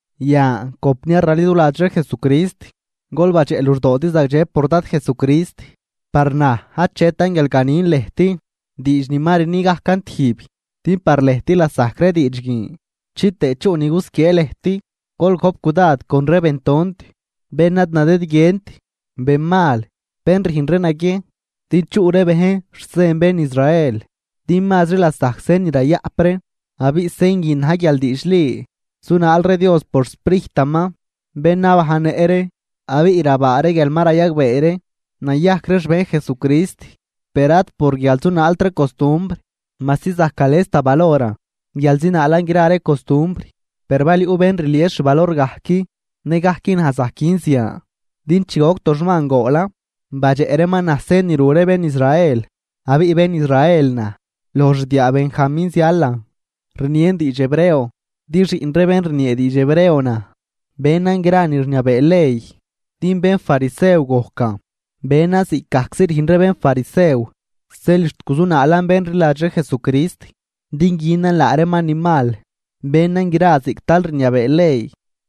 Yan, compniar raliduladx ree Jesucrist, gol badxeꞌ luxdoodi zagdxe por Dad Jesucrist. Par naj achetan guial ganin lëjt diidx ni ma rni gajcan tijb, din par lëjt lasajc ree diidx guin chitëë chuꞌ ni gusquiee lëjt. Gol gojp cudad con ree bentont, bén ad nadëdguient, benmal, bén rüjn ree naguiejn din chuꞌ ree bejn xsen bén Israel. Din mazri lasajc sen ni rayaꞌp ree, abiꞌ sen guin na̱j guial diidxli zunaal ree Dios por xSprijtaman bén nabajnnëꞌ ree, abiꞌ rabaa ree guial ma rayagbee ree nayajc ree xbejn Jesucrist, per ad por guial zunaalt ree costumbr. Majsi zajc gales da valoran guial zinaalan gra ree costumbr, per bal yuꞌ bén rlies xvalor gajc, nëgajc naj zajc gün zian. Din chi goc toxman goolan, badxeꞌ reeman naj sen ni ru ree bén Israel. Abiꞌ bén Israel naj, loj xdiaa Benjamín zialan, rnien diidx Hebreo din xiꞌn ree bén rniee diidx Hebreo naj. Benan gra ni rniabee ley din bénfarisew gojcan. Benan ziꞌcgajczi rüjn ree bénfarisew, zeel xt guzunaalan bén rliladx ree Jesucrist din günan laa reeman ni mal, benan gra ziꞌc tal rniabee ley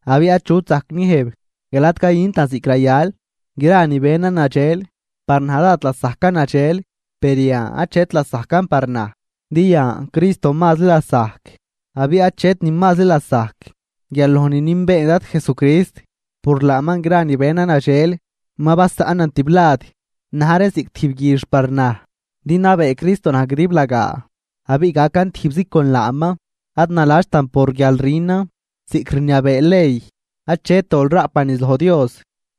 abiꞌ achut zajc niëjb guial ad cayüntan ziꞌc rayal. Gra ni benan nadxel, par naj dád lasajcan nadxel, per yan achet lasajcan par naj, din yan Cristo mazri lasajc. Abiꞌ achet ni mazri lasajc guial loj ni nünbeen Dad Jesucrist, por laaman gra ni benan nadxel ma basaꞌnan tiblad, na̱j reen ziꞌc tijb guix par naj din nabee Cristo naj guidiblagaa, abiꞌ gacan tijbzi con laaman. Ad naladxtan por guial rünan ziꞌc rniabee ley achet dol raꞌpan niz loj Dios,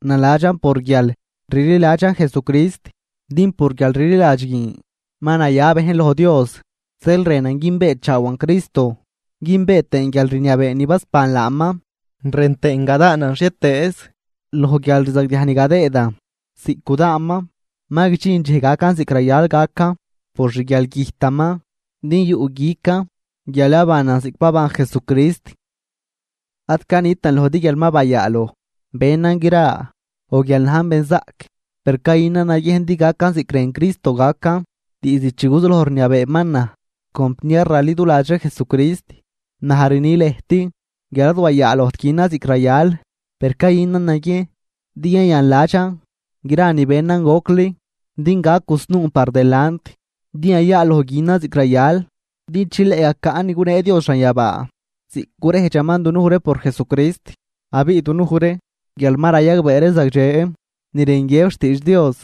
naladxan por guial rliladxan Jesucrist, din por guialrliladx guin ma naya bejn loj Dios. Zeel rënan günbeechaawan Cristo, günbee tëën guialrniabee ni basban laaman, rën tëën gadaanan xhietëëz loj guialrzagdiaj ni gadëëdan ziꞌc gudaanman, ma guidxin dxej gacan ziꞌc rayal gacan por xguialgüjtaman. Din yuꞌguican guial yabanan ziꞌc baban Jesucrist. Ad canitan lojdi guial ma bayaaloj benan gra o guial najn benzaꞌc, per cayünan naguiejn din gacan ziꞌc rën Cristo gacan diizd chi guzuloj rniabeeman naj. Compniar raliduladx ree Jesucrist, naj rni lëjt guial ad wayaalojt günan ziꞌc rayal, per cayünan naguiejn din yayanladxan gra ni benan gocli din gac gusnuun par delant, din yayaaloj günan ziꞌc rayal din chileꞌ gacaꞌn ni gunee Dios xanyabaa ziꞌc gurejdxaman dunuj ree por Jesucrist. Abiꞌ dunuj ree guial ma rayagbee ree zagdxe ni rën guiëb xtiidx Dios,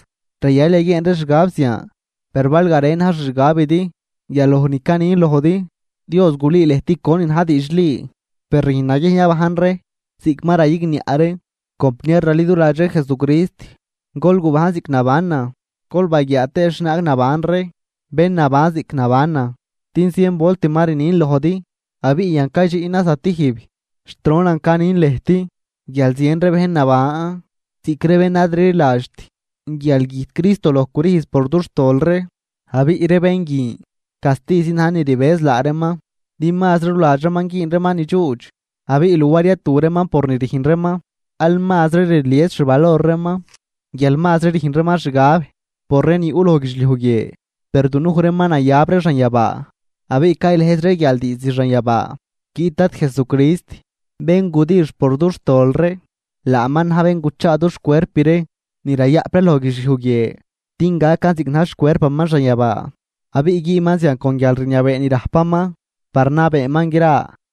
rayal yaguieen ree xgab zian. Per bal garen na̱j xixgabidi guial loj ni canin lojdi, Dios gulüü lëjt conin na̱j diidxli. Per rüjn naguiejn yabajn ree ziꞌc ma rayigniaꞌ ree. Compniar raliduladx ree Jesucrist, gol gubajn ziꞌc nabanan, gol baguiaa tëë xhienaag naban ree bén naban ziꞌc nabanan. Din zien volt ma rnin lojdi abiꞌ yan caydxiꞌnan zatijb, xt ronan canin lëjt guial zien ree bejn naban ziꞌc ree bén ad rliladxt guial güjt Cristo loj crüjz por dux xtol ree. Abiꞌ ree bén guin castizi na̱j ni rbëz laa reeman din mazri ruladx reeman güün reeman ni dxuudx. Abiꞌ luar yatu reeman por ni rüjn reeman aal mazri rlies xvalor reeman guial mazri rüjn reeman xgab por ree ni yuꞌ loj guidxliuj guie. Per dunuj ree ma nayab ree xanyabaa abiꞌ caylëjz ree guial diizd xanyabaa guiꞌt Dad Jesucrist bén gudix por dux tol ree. Laaman na̱j bén guchaa dux cuerp ree ni rayaꞌp ree loj guidxliuj guie din gacan ziꞌc na̱j xcuerpaman xanyabaa. Abiꞌ güünman zian con guialrniabee ni rajpaman par nabeeman gra.